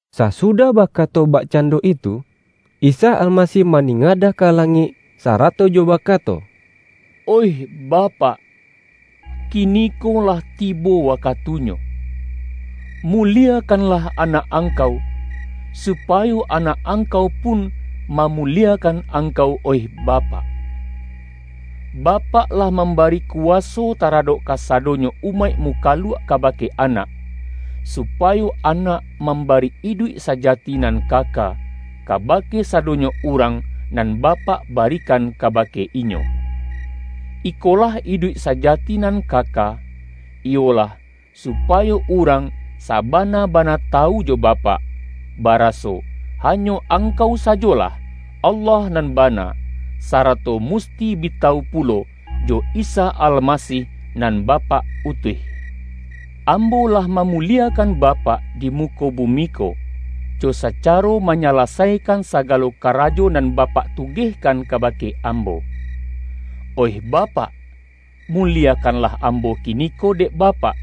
Sasudah bakato bakcando itu, Isa Almasih maningadah ka la-ngik sarato jo bakato,”Oih Bapak, ki-niko lah tibo wakatunyo. Muliekanlah Anak Angkau, supayo Anak Angkau pun mamuliekan Angkau oih Bapak. Bapak lah mambari kuwaso taradok kasadonyo umaik mukaluak kabake Anak, supayo Anak mambari iduik sa-jati nan kaka, kabake sadonyo urang nan Bapak barikan kabake Inyo. Iko-lah iduik sajati nan kaka, iyolah, su-payo urang sabana-bana tawu jo Ba-pak, baraso hanyo Angkau sajolah, Allah nan bana, sarato musti bi tawu pulo, jo Isa Almasih nan Bapak utuih. Ambo lah mamuliekan Bapak di mu-ko bumi ko, jo sacaro manyalasaikan sagalo karajo nan Bapak tugehkan ka-bake Ambo. Oih Bapak! Muliekanlah Ambo kiniko dek Bapak,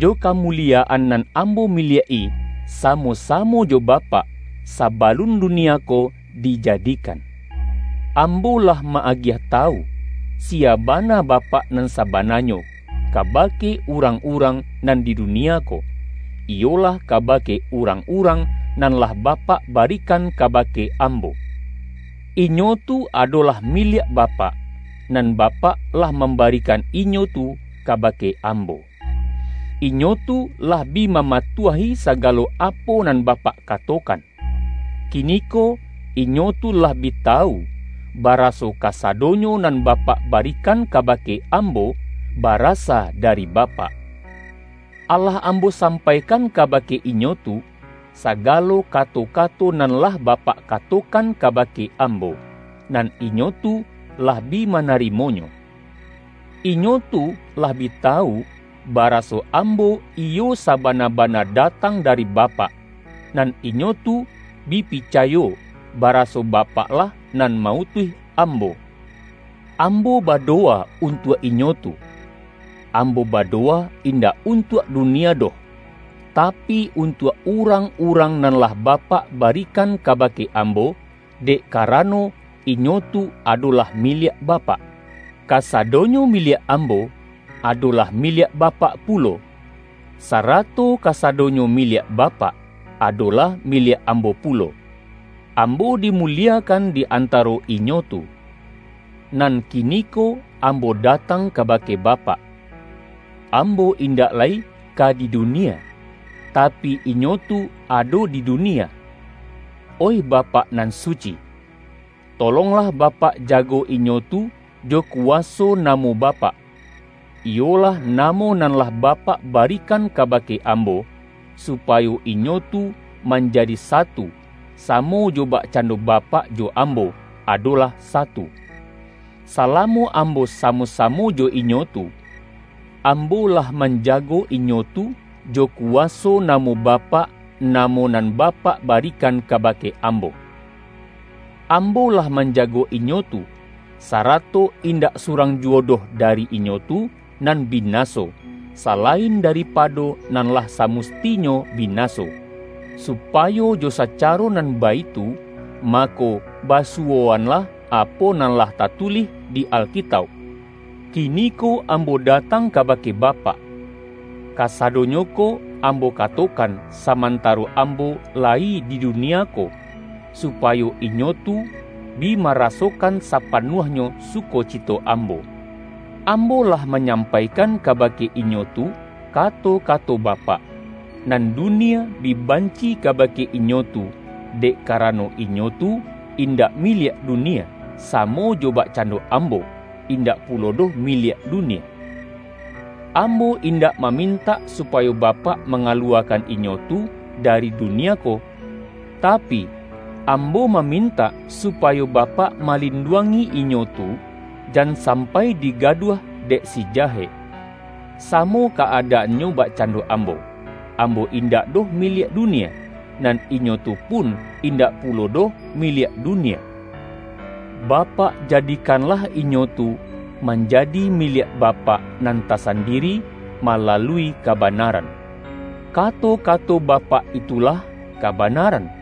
jo kamuliya-an nan Ambo miliak-i samo-samo jo Bapak, sabalun dunia ko dijadikan. Ambo lah ma-agiah tawu, siya bana Bapak nan sabananyo, kabake urang-urang nan di dunia ko, iyolah kabake urang-urang nan lah Bapak barikan ka-bake Ambo. Inyo tu adolah miliak Ba-pak, nan Bapak lah mambarikan inyo tu kabake Ambo. Inyo tu lah bi mama-tuahi sagalo apo nan Bapak katokan. Kiniko inyo tu lah bi tawu, baraso kasadonyo nan Bapak barikan kabake Ambo, barasa dari Bapak. Alah Ambo sampaikan kabake inyo tu, sagalo ka-to-kato nan lah Bapak katokan kabake Ambo, nan inyo tu lah bi manarimo-nyo. Inyo tu lah bi tawu, baraso Ambo iyo sabana-bana datang dari Bapak, nan inyo tu bi picayo baraso Bapak-lah nan ma-utuih Ambo. Ambo badowa untuak inyo tu. Ambo badowa indak untuak dunia doh, ta-pi untuak urang-urang nan lah Ba-pak barikan kabake Ambo, dek ka-rano, inyo tu adolah miliak Bapak. Kasadonyo miliak Ambo, adolah miliak Bapak pulo, sarato kasadonyo miliak Bapak, adolah miliak Ambo pu-lo. Ambo dimuliekan di antaro inyo tu. Nan kiniko Ambo datang kaba-ke Bapak. Ambo indak lai ka di dunia, tapi inyo tu ado di dunia. Oih Bapak nan suci! Tolonglah Bapak jago inyo tu jo kuwaso namo Bapak, iyolah, namo nan lah Bapak barikan kabake Ambo — supayo inyo tu manjadi satu, samo jo bakcando Bapak jo Ambo, adolah satu. Salamo Ambo samo-samo jo inyo tu, Ambo lah manjago inyo tu jo kuwaso namo Bapak namo nan Ba-pak barikan kabake Ambo. Ambo lah manjago inyo tu, sarato indak surang juwo doh dari inyo tu nan binaso, salain daripado nan lah samustinyo bi-naso; supayo jo sacaro nan baitu, ma-ko basuwoanlah apo nan lah tatulih di Alkitauk. Kiniko Ambo datang ka-bake Bapak. Kasadonyo ko Ambo ka-tokan, samantaro Ambo layi di dunia ko, supayo inyo tu bi marasokan sa-panuahnyo sukocito Ambo. Ambo lah manyampaikan kabake inyo tu ka-to-kato Bapak, nan dunia bi banci ka-bake inyo tu, dek karano inyo tu in-dak miliak dunia, samo jo bakcando Ambo, indak pulo doh miliak dunia. Ambo indak mamintak supayo Ba-pak mangaluwakan inyo tu dari du-nia ko, tapi, Ambo mamintak supayo Bapak malinduangi inyo tu, jan sam-pai digaduah dek si Jahek. Samo ka-adaannyo bakcando Ambo, Ambo in-dak doh miliak dunia, nan inyo tu pun indak pulo doh miliak dunia. Bapak jadikanlah inyo tu, manjadi miliak Ba-pak nan tasandiri malalui kabanaran. Kato-kato Bapak itulah kabanaran.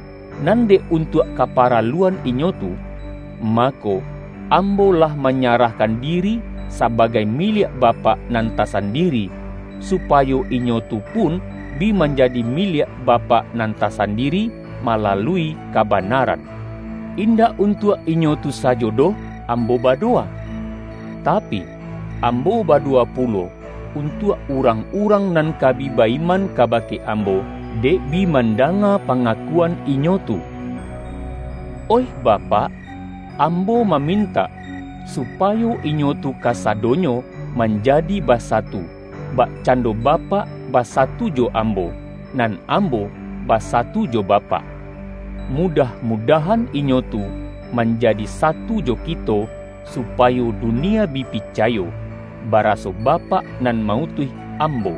Nan dek un-tuak kaparaluan inyo tu, mako, Ambo lah manyarahkan diri sabagai miliak Bapak nan tasandiri, supayo inyo tu pun bi manjadi miliak Bapak nan ta-sandiri malalui kabanaran. Indak untuak inyo tu sajo doh Ambo badowa. Tapi, Ambo badowa pulo un-tuak urang-urang nan ka bi ba-iman kabake Ambo, dek bi mandanga pa-ngakuan inyo tu. Oih Bapak, Ambo mamintak, supayo inyo tu kasadonyo manjadi basatu, bakcando Bapak basa-tu jo Ambo, nan Ambo basatu jo Bapak. Mudah-mudahan inyo tu manjadi satu jo Kito, supayo dunia bi picayo, baraso Bapak nan ma-utuih Ambo.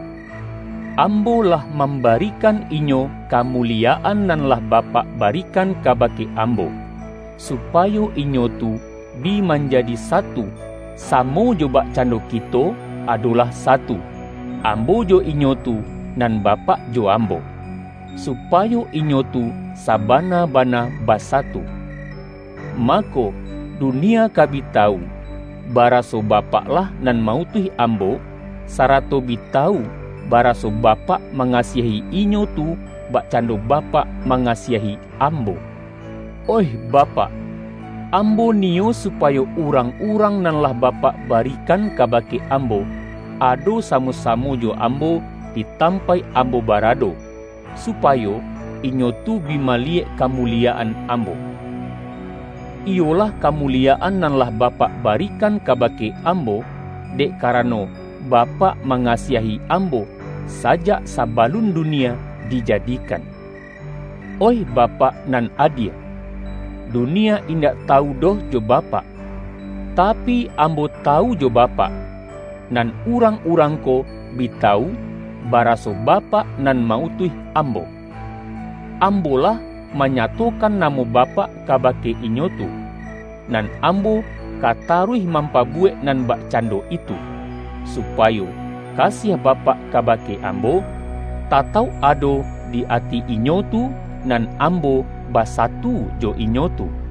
Ambo lah mambarikan inyo kamuliyaan nan lah Bapak barikan kabake Ambo, su-payo inyo tu bi manjadi satu, samo jo bakcando Kito, adolah satu; Ambo jo inyo tu, nan Bapak jo Ambo; supayo inyo tu sabana-bana basatu. Mako, du-nia ka bi tawu, baraso Bapak-lah nan ma-utuih Ambo, sarato bi tawu bara-so Bapak mangasiahi inyo tu, bakcan-do Bapak mangasiahi Ambo. Oih Bapak, Ambo niyo supayo urang-urang nan lah Bapak barikan kabake Ambo, ado samo-samo jo Ambo di tampaik Ambo barado, supayo inyo tu bi maliyek kamuliyaan Ambo; iyo-lah kamuliyaan nan lah Bapak barikan kabake Ambo, dek karano Bapak ma-ngasiahi Ambo sajak sabalun dunia di-jadikan. Oih Bapak nan adie! Dunia indak tawu doh jo Bapak, tapi, Ambo tawu jo Bapak; nan urang-urang ko bi tawu, baraso Bapak nan ma-utuih Ambo. Ambo lah manyatokan na-mo Bapak kabake inyo tu; nan Ambo ka taruih mampabuwek nan bakcan-do itu, supayo kasiah Bapak kabake Ambo, tatauk ado di ati inyo tu, nan Ambo basatu jo inyo tu.” YAHYA